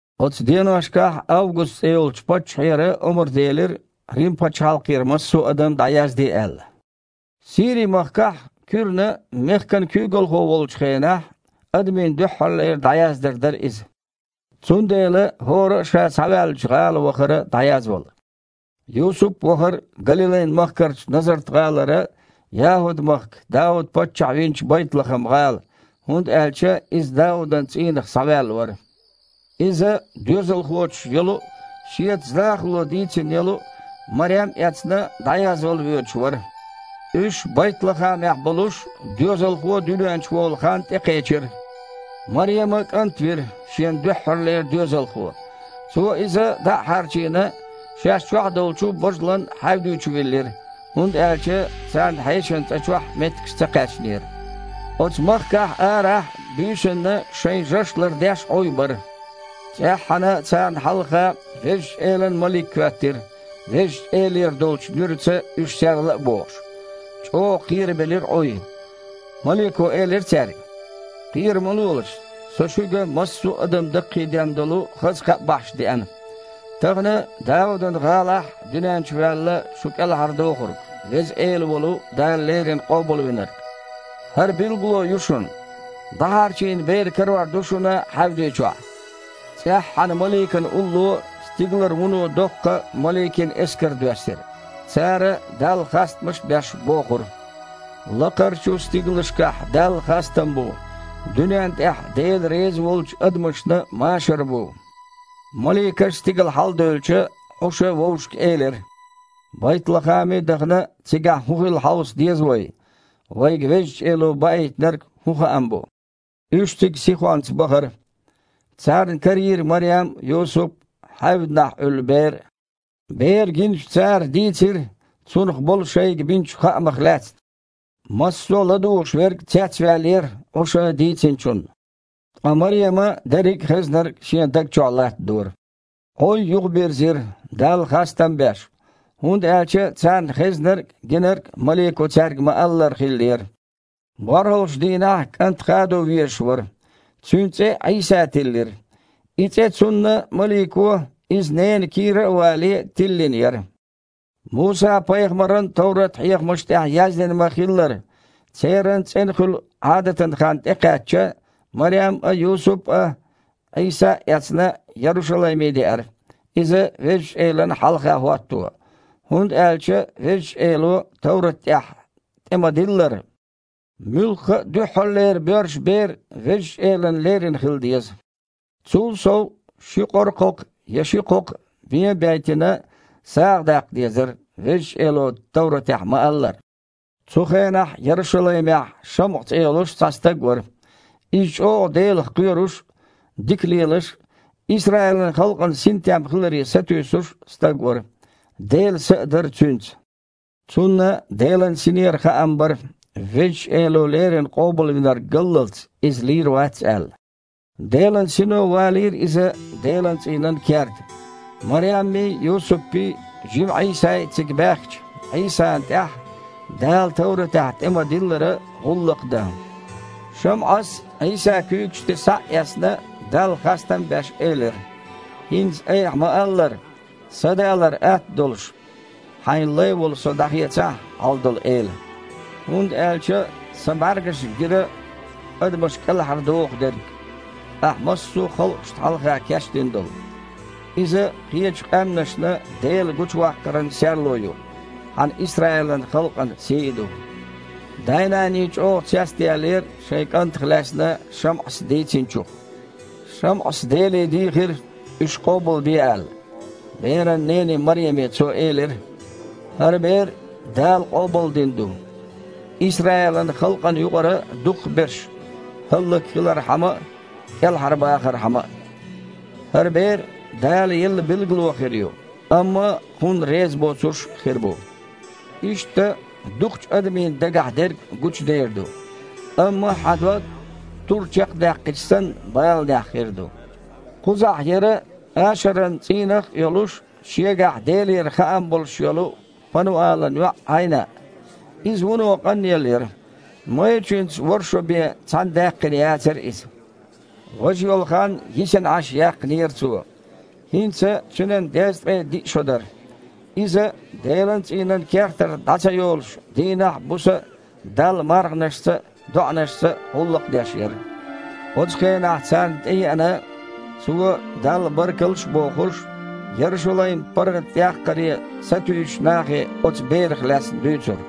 Оцу деношкахь Август цІе йолчу паччахьера омра делира, Рим-пачхьалкхера массо а адам дІаязде аьлла. Сири-махкахь Куьрна мехкан куьйгалхо волчу хенахь, адамийн дуьххьарлера дІаяздар дара иза. Цундела хІора а ша схьаваьллачу гІала вахара дІаязвала. Юсуп а вахара Галилайн махкарчу Назарт-гІалара ЯхІуд-махка Дауд-паччахь винчу Байтлахам-гІала, хІунда аьлча иза Даудан цІийнах схьаваьлла вара. Иза, доьзалхочух йолу а, шеца захало дийцина йолу а Марем а эцна, дІаязвала воьдуш вара. Уьш Байтлахамехь болуш доьзалхо дуьнен чу волу хан тІекхечира. Марема кІант вира, шен дуьххьарлера доьзалхо. Цо иза, дІа а хьарчийна, шаьш чохь долчу божалан хьаьвди чу виллира, хІунда аьлча царна хьешан цІа чохь меттигаш ца кхаьчнера. Оцу махкахь арахь буьйсанна шайн жаш лардеш Іуй бара. ЦІеххьана царна хьалха Везачу Элан малик хІоьттира, Везачу Элера долчу нуьраца уьш серла а бохуш. ЧІогІа кхерабелира Іуй. Малико элира цаьрга: «Кхера ма лолаш! Со шуьга массо а адам даккхийден долу хаза кхаъ бахьаш деана! Тахана Даудан гІалахь дуьнен чу ваьлла шу кІелхьардохург, Веза Эла волу Дала леррина Къобалвинарг. ХІара билгало ю шуна: ДІахьарчийна Бер карор ду шуна хьаьвди чохь». ЦІеххьана маликана улло стигалара вуно доккха маликийн эскар доьссира. Цара, Далла хастамаш а беш, бохура: «Лакхарчу стигалшкахь Далла хастам бу! Дуьнен тІехь Дела реза волчу адамашна машар бу!» Маликаш стигала хьаладевлча, Іуша вовшашка элира: «Байтлахаме а дахана, цигахь хІун хилла хьовса деза вай, вайга Везачу Эло баийтинарг хІун хаам бу». Уьш цига сихонца бахара. Царна карийра Марем а, Юсуп а, хьаьвданахь Іуьллу Бер а. Бер гиначу цара дийцира, Цунах болу шайга бинчу хаамах лаьцна. Массо а ладугІуш верг цецваьллера Іуша дийцинчунна. Ткъа Марема дерриг а хезнарг шен даг чохь латтадора. Іуй юхабирзира, Далла хастам а беш, хІунда аьлча царна хезнарг а, гинарг а малико цаьрга ма-аллара хиллера. БорхІалгІачу дийнахь кІант хадо везаш вара. Цуьнан цІе Іийса тиллира. И цІе цунна малико, иза ненан кийра а вале, тиллина яра. Муса-пайхамаран товрат-хьехамаш тІехь яздина ма-хиллара, церан цІена хуьлу Іадатан хан тІекхаьчча, Марем а, Юсуп а, Іийса а эцна, Ярушалайме деара Иза Везачу Элана хьалха хІотто. ХІунда аьлча Везачу Эло товрат тІехь тІе-ма-диллара: «Муьлхха а дуьххьарлера боьрша бер Везачу Элана лерина хила деза». Цул сов, ши кхокха я къоркхокха, бен а бейтина, сагІа даккха дезара, Везачу Эло товратехь ма-аллара. Цу хенахь Ярушалаймехь ШамІа цІе йолуш цхьа стаг вара. Иза чІогІа Делах кхоьруш а, дика лелаш а, Исраилан халкъана синтем хиларе сатуьйсуш а стаг вара. Делан Са а дара цуьнца. Цунна Делан Синера хаам бара, Везачу Эло леррина Къобалвинарг галлалц, иза лийр вац аьлла. Делан Сино валийра иза Делан цІийнан керта. Мареммий, Юсуппий, жима Іийсай цига баьхкича, Іийсана тІехь, Дала товратахь тІе ма-диллара, гІуллакх дан, ШамІас, Іийса куьйгаш тІе схьа а эцна, Далла хастам а беш, элира: «ХІинца, Айхьа ма-аллара, садалар атта долуш, Хьайн лай волу со дІахецахьа, Хьалдолу Эла, хІунда аьлча сан бІаьргашна гира адамаш кІелхьардоху дерг, Ахь массо а халкъашна хьалха кечдина долу. Иза кхечу къаьмнашна Дела гучуваккхаран серло а ю, Хьан Исраилан халкъан сий а ду!» Дай-наний чІогІа цецдаьллера шайн кІантах лаьцна ШамІас дийцинчух. ШамІас Деле дийхира, уьш къобалбе аьлла. Беран нене Мареме цо элира: «ХІара бер Дала къобалдина ду, Исраилан халкъана юкъара дукхахберш хІаллакьхилархьама а, кІелхьарбахархьама а. ХІара Бер Дала елла билгало хир ю, амма Кхунна резабоцурш а хир бу. Иштта, дукхачу адамийн дагахь дерг гучудер ду. Амма хьан дог, тур чекхдаьккхича санна, баланехь хир ду». Кхузахь яра Ашаран цІийнах а йолуш, шегахь Делера хаам болуш йолу Пануалан йоІ Іайнаъ. Иза вуно къанъелла яра. Майрачуьнца ворхІ шо бен цхьаьна даьккхина яцара иза. Важа йолу хан йисина Іаш яьккхинера цо. ХІинца цуьнан дезткъе диъ шо дара. Иза, Делан цІийнан кертара дІа ца йолуш, дийнахь а, буса а Далла марханашца а, доІанашца а гІуллакх деш яра. Оцу хенахь царна тІееана, цо, Далла баркалла а бохуш, Ярушалайм паргІатъяккхаре сатуьйсучу нахе оцу Берах лаьцна дуьйцура.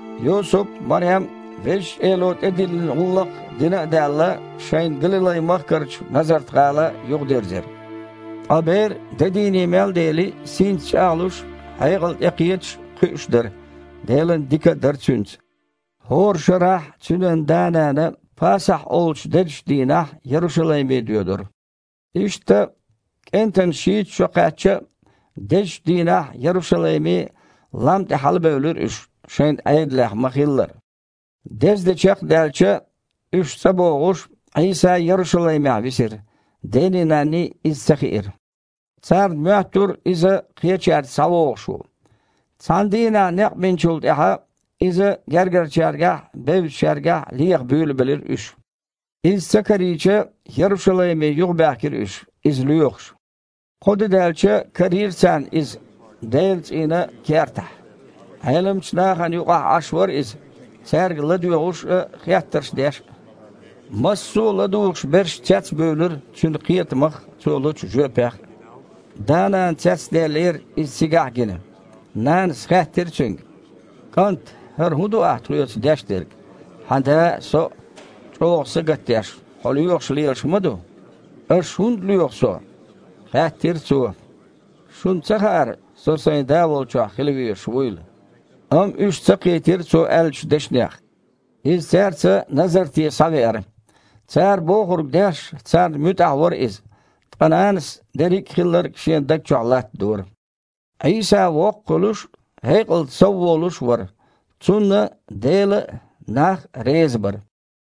Юсуп а, Марем а Везачу Эло тІедиллина гІуллакх дина а даьлла, шайн Галилай-махкарчу Назарт-гІала юхадирзира. Ткъа Бер, де дийне мел дели, синца чІагІлуш а, хьекъал тІекхеташ а, кхуьуш дара, Дела дика а дара Цуьнца. ХІора шарахь цуьнан да-нана Пасахь олучу дезачу дийнахь Ярушалайме доьдура. Иштта КІентан шийтта шо кхаьчча а, дезчу дийнахь Ярушалайме, лам тІе хьалабевлира уьш, шайн Іедалехь ма-хиллара. Дезде чекхдаьлча, уьш цІа богІуш, Іийса Ярушалаймехь висира. Дений-нанний иза ца хиира. Царна моьттура Иза кхечаьрца схьавогІуш ву. Цхьана дийнахь некъ бинчул тІаьхьа, Иза гергарчаьргахь а, бевзачаьргахь а леха буьйлабелира уьш. Иза ца карийча, Ярушалайме юхабаьхкира уьш, Иза лоьхуш. Кхо де даьлча, карийра царна Иза Делан цІийнан кертахь. Іеламчу нахана юкъахь Іаш вара Иза, цаьрга ладоьгІуш а, хеттарш деш а. Массо а ладугІуш берш цецбуьйлура Цуьнан кхетамах а, Цо лучу жоьпех а. Да-нана цецдаьллера, Иза цигахь а гина. Нанас хаьттира Цуьнга: «КІант, хІара хІун ду ахь тхоьца деш дерг? Хьан да а, со а чІогІа сагатдеш, Хьо лоьхуш лелаш ма ду». «Аш хІунда лоьху Со? – хаьттира Цо. – Шуна ца хаьара, Со Сайн Да волчохь хила везаш вуйла?» Амма уьш ца кхийтира Цо аьллачу дешнех. Иза цаьрца Назарте схьавеара. Цара бохург деш, царна муьтІахь вара Иза. Ткъа нанас дерриг а хилларг шен даг чохь латтадора. Іийса воккха хуьлуш а, хьекъалца совволуш а вара. Цунна Дела а, нах а реза бара.